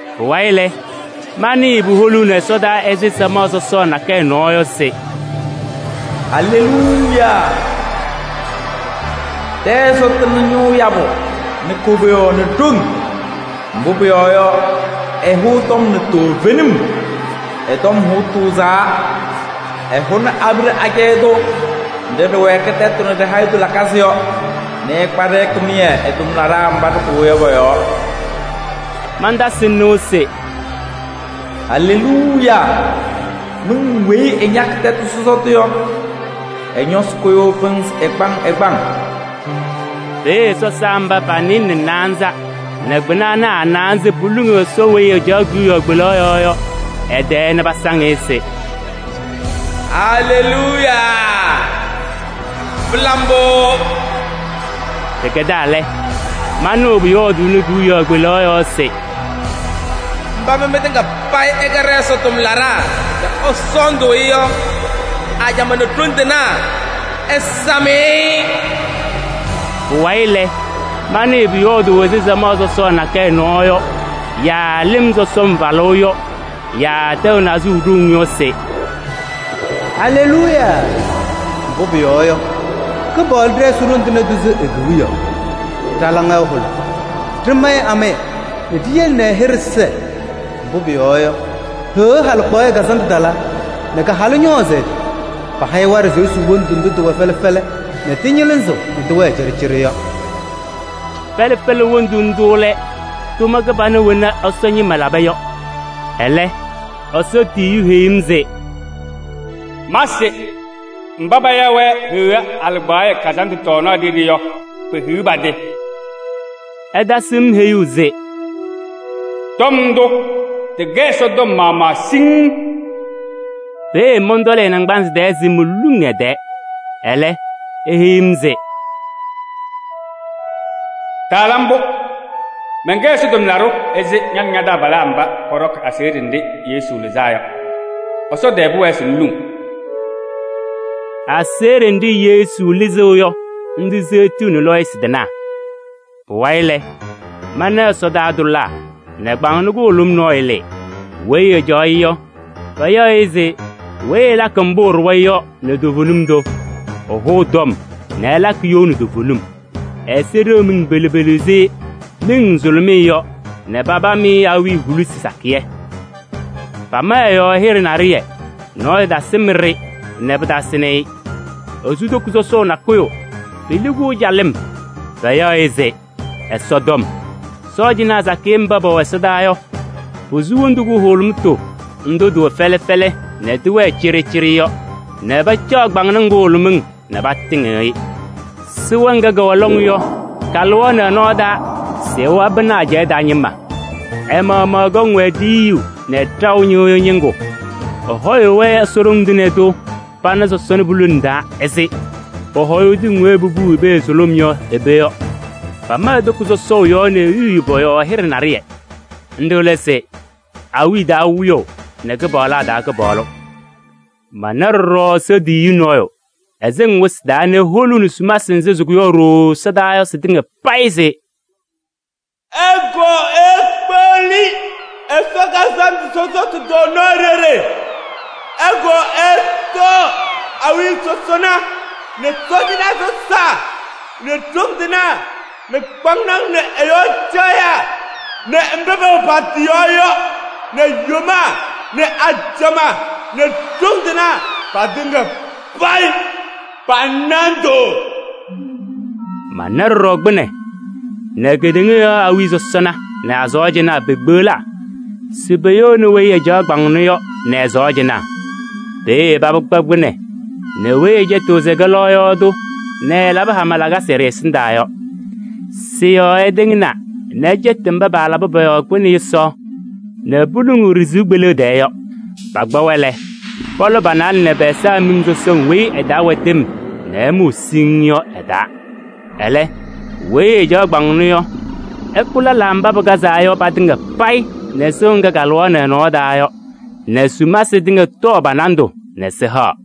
Pʋwayɩ lɛ, manɩɩ puholuuni ɛsɔdaa ɛzɩ samaɣ sɔsɔɔ nakɛyɛ nɔɔ yɔ se: “Aleluuya! Ɖɛ-Ɛsɔ tɩnɩ ñʋʋ yabʋ nɛ koboyaɣ nɛ ɖoŋ! Mbʋ pʋyɔɔ yɔ, ɛhʋʋ tɔm nɛ toovenim, ɛ-tɔm hʋʋ tʋʋzaa. Ɛhʋnɩ abiɖe nɖɩ ɖɩpɛdaɣ ɖɩ-tɩ nɛ ɖɩwɛɛkɩ tɛtʋ nɛ ɖi-hayitu lakasɩ yɔ nɛ ɛkpa-ɖɩ kɩmɩyɛ ɛ-tʋmlaɖaa mba ɖɩkʋwa yɔ pɔ-yɔɔ.” Mantasɩ nɩʋ se: “Aleluuya! Miŋ weyi ɛñakɩ tɛtʋ sɔsɔtʋ yɔ, ɛ-ñɔsɩ kʋyʋʋ pɩnzɩ ɛgbaŋ ɛgbaŋ.” Peeye sɔsaa mba pa-nɩɩlɛ nɛ naanza nɛ kpɩna ana a-naanza poluŋ Ɛsɔ weyi ɛcaɣ kewiyaɣ kpelaɣ yɔɔ yɔ ɛ-tɛɛ nɛ pasaŋ-ɩ se: “Aleluuya! Pɩla mbʋ!” Pɩkɛdaa lɛ, manɩɣ pʋyɔɔdʋʋnɩ kewiyaɣ kpelaɣ yɔɔ se: “Mba mɩ mɩtɩŋa payɩ ɩkɛ ɖɛ-Ɛsɔ tʋmlaɖaa nɛ ɩsɔɔndʋʋ-ɩ yɔ, ajamaa nɛ ɖoŋ tɩnaa ɩsam-ɩ!” Pʋwayɩ lɛ, manɩɩ pʋyɔɔdʋʋ ɛzɩ samaɣ sɔsɔɔ nakɛyɛ nɔɔ yɔ yaa lɩm sɔsɔm falʋʋ yɔ yaa tɛʋ nazʋʋ ɖoŋ yɔ se: “Aleluuya! Mbʋ pʋyɔɔ yɔ, Kɩpaɣlʋ ɖɛ-Ɛsɔ Ɖoŋ Tɩŋa Tʋ sɩ e-Kewiyaɣ. Ɖa-laŋa ɛhʋlʋmɩ, ɖɩmayɩ amaya nɛ ɖiyele ɛ-hɩɖɛ sɛɛ. Mbʋ pʋyɔɔ yɔ, Heɣa halɩkpaɣyɛ kazandʋ talaa nɛ ka-halʋ ñɔɔzɩ ɛ-tɩ. Paha-ɩ waɖɛ se esuu wondu ndʋ tɩwɛ fɛlɛ fɛlɛ nɛ tɩñɩlɩzɩɣ nɛ tɩwɛɛ cɩɖɩcɩɖɩ yɔ.” Fɛlɛ fɛlɛ wondu ndʋ lɛ tʋma kɩbana wena Ɛsɔ ñɩma laba yɔ. Ɛlɛ Ɛsɔ tiyiyu heyi-m se: “Ma se: mba paya-wɛ Heɣa halɩkpaɣyɛ kazandʋ tɔɔnaɣ ɖeɖe yɔ, pehiɣ pa-tɩ!” Ɛtasɩ-m heyuu se: “Tɔm ndʋ, tɩkɛ Ɛsɔ tɔm maɣmaɣ siŋŋ.” Peeye mɔntɔlɩ ɛ-naŋgbanzɩ tɛɛ se moluŋ ɛ-tɛɛ. Ɛlɛ, eheyi-m se: “Taala mbʋ! Mɛnkɛ Ɛsɔ tʋmlaɖʋ ɛzɩ ña nɛ ña-taabalaa mba pɔɖɔkɩ aseɣɖe nɖɩ Yesu lɩzaa yɔ. Ɛsɔ tɛɛ pʋwɛɛ se ŋluŋ!” Aseɣɖe nɖɩ Yesu lɩzɩɣ yɔ, nɖɩ seɣtiɣni lɔɔyɩsɩ tɩnaa. Pʋwayɩ lɛ, mana ɛsɔdaa tʋlaa nɛ kpaŋnɔ kʋhʋlʋm nɔɔyʋ lɩɩ. Weyi ɛcaɣ-ɩ yɔ, payaɣ-ɩ se Weyi Ɛlakɩ Mbʋ Ɛɖʋwa yɔ nɛ Toovenim Tʋ. Ɛhʋʋ tɔm nɛ ɛlakɩ you nɛ toovenim. Ɛ-ɛza ɖeɣ miŋ pelu pelu ɛzɩ miŋ nzʋlʋmɩyɛ yɔ nɛ papam-ɩ awiya hulisi sakɩyɛ. Pama ɛ-yɔɔ hɩɖɛ naɖɩyɛ, nɔɔyʋ tasɩm-ɖɩ nɛ pɩtasɩnɩ-ɩ. Esu toko sɔsɔʋ nakʋyʋ, peli-kʋ calɩm. Payaɣ-ɩ se: Ɛsɔtɔm. Sɔɔjanaa sakɩyɛ mba pɛwɛ ɛsɔdaa yɔ, posu wondu kʋhʋlʋmʋtʋ ndʋ tɩwɛ fɛlɛ fɛlɛ nɛ tɩwɛɛ cɩɖɩcɩɖɩ yɔ nɛ pacaɣ kpaŋnaŋ kʋhʋlʋmɩŋ nɛ patɩŋɩɣ-ɩ. Sɩɣa ŋga kɛwɛ lɔŋ yɔ, kalɩɣaɣnɩ ɛ-nɔɔ taa se ɛwabɩnɩ ajɛɛ taa ñɩma. Ɛ-maɣmaɣ ɛkɔŋ-wɛ ɖiyuu nɛ ɖaʋ ñɩɣyʋʋ ñɩŋgʋ. Ɛhɔyʋʋ-wɛ Ɛsɔ Ɖoŋ Tɩŋa Tʋ pana sɔsɔna pulone taa ɛzɩ pɔhɔyʋʋ tɩŋ weyi popuu i-pee sʋlʋm yɔ i-pee yɔ. Pama e-toko sɔsɔʋ nɛ e-yuye pɔ-yɔɔ hɩɖɛ naɖɩyɛ. Nɖɩ lɛ se: awiya taa Wiyaʋ nɛ kɩpaɣlaa taa Kɩpaɣlʋ. Mana ɖɔɖɔ Ɛsɔ tiyiyu nɔɔyʋ, ɛsɩŋ wɩsɩ taa nɛ eholuuni sumasɩ nzɩ sɩkʋyaɣ ɖooo ɛsɔdaa yɔ sɩtɩŋa payɩ se: “Ɩkɔɔ ikpeɣli Ɛsɔ kazandʋ sɔsɔtʋ tɔɔnaɣ ɖeɖe! Ɩkɔɔ ɩtɔɔ awiya sɔsɔna nɛ sɔɔjanaa sɔsaa nɛ ɖoŋ tɩnaa nɛ kpaŋnaŋ nɛ ɩ-yɔɔ caɣyaa nɛ mba pɛwɛ pa-tɩ yɔɔ yɔ nɛ yomaa nɛ ajamaa nɛ ɖoŋ tɩnaa patɩŋa payɩ pa-nandʋ.” Mana ɖɔɖɔ kpɩnɛ nɛ kedeŋa yɔɔ awiya sɔsɔna nɛ a-sɔɔjanaa pekpeɣlaa se poyouni weyi ɛcaɣ kpaŋnɔ yɔ nɛ ɛ-sɔɔjanaa. Peeye paba kpa kpɩnɛ nɛ weyi ɛcɛtɩɣ se ɛkɛ lɔɔyaɣ tʋ nɛ ɛɛlabɩ hama lakasɩ ɖɩ-ɛsɩndaa yɔ. Sɩ-yɔɔ ɛtɩŋnaa nɛ ɛcɛtɩ mba paalabɩ pɔ-yɔɔ kpɩnɛ yʋsaɣ nɛ poluŋuu ɖɩ-sɩʋ kpeleɣ tɛɛ yɔ. Pakpa-wɛ lɛ, pɔlɔ pa-naalɛ nɛ pɛ-ɛza miŋ sɔsɔŋ weyi ɛ-taa wɛ tɩm nɛ ɛmʋʋ siŋŋ yɔ ɛ-taa. Ɛlɛ weyi ɛcaɣ kpaŋnɔ yɔ, ɛkʋ lɛlaa mba pɩkazaa yɔ patɩŋa payɩ nɛ sɩɣa ŋga kalɩɣaɣnɩ ɛ-nɔɔ taa yɔ nɛ sumasɩ tɩŋa tɔɔ pa-nandʋ nɛ sɩhaɣ.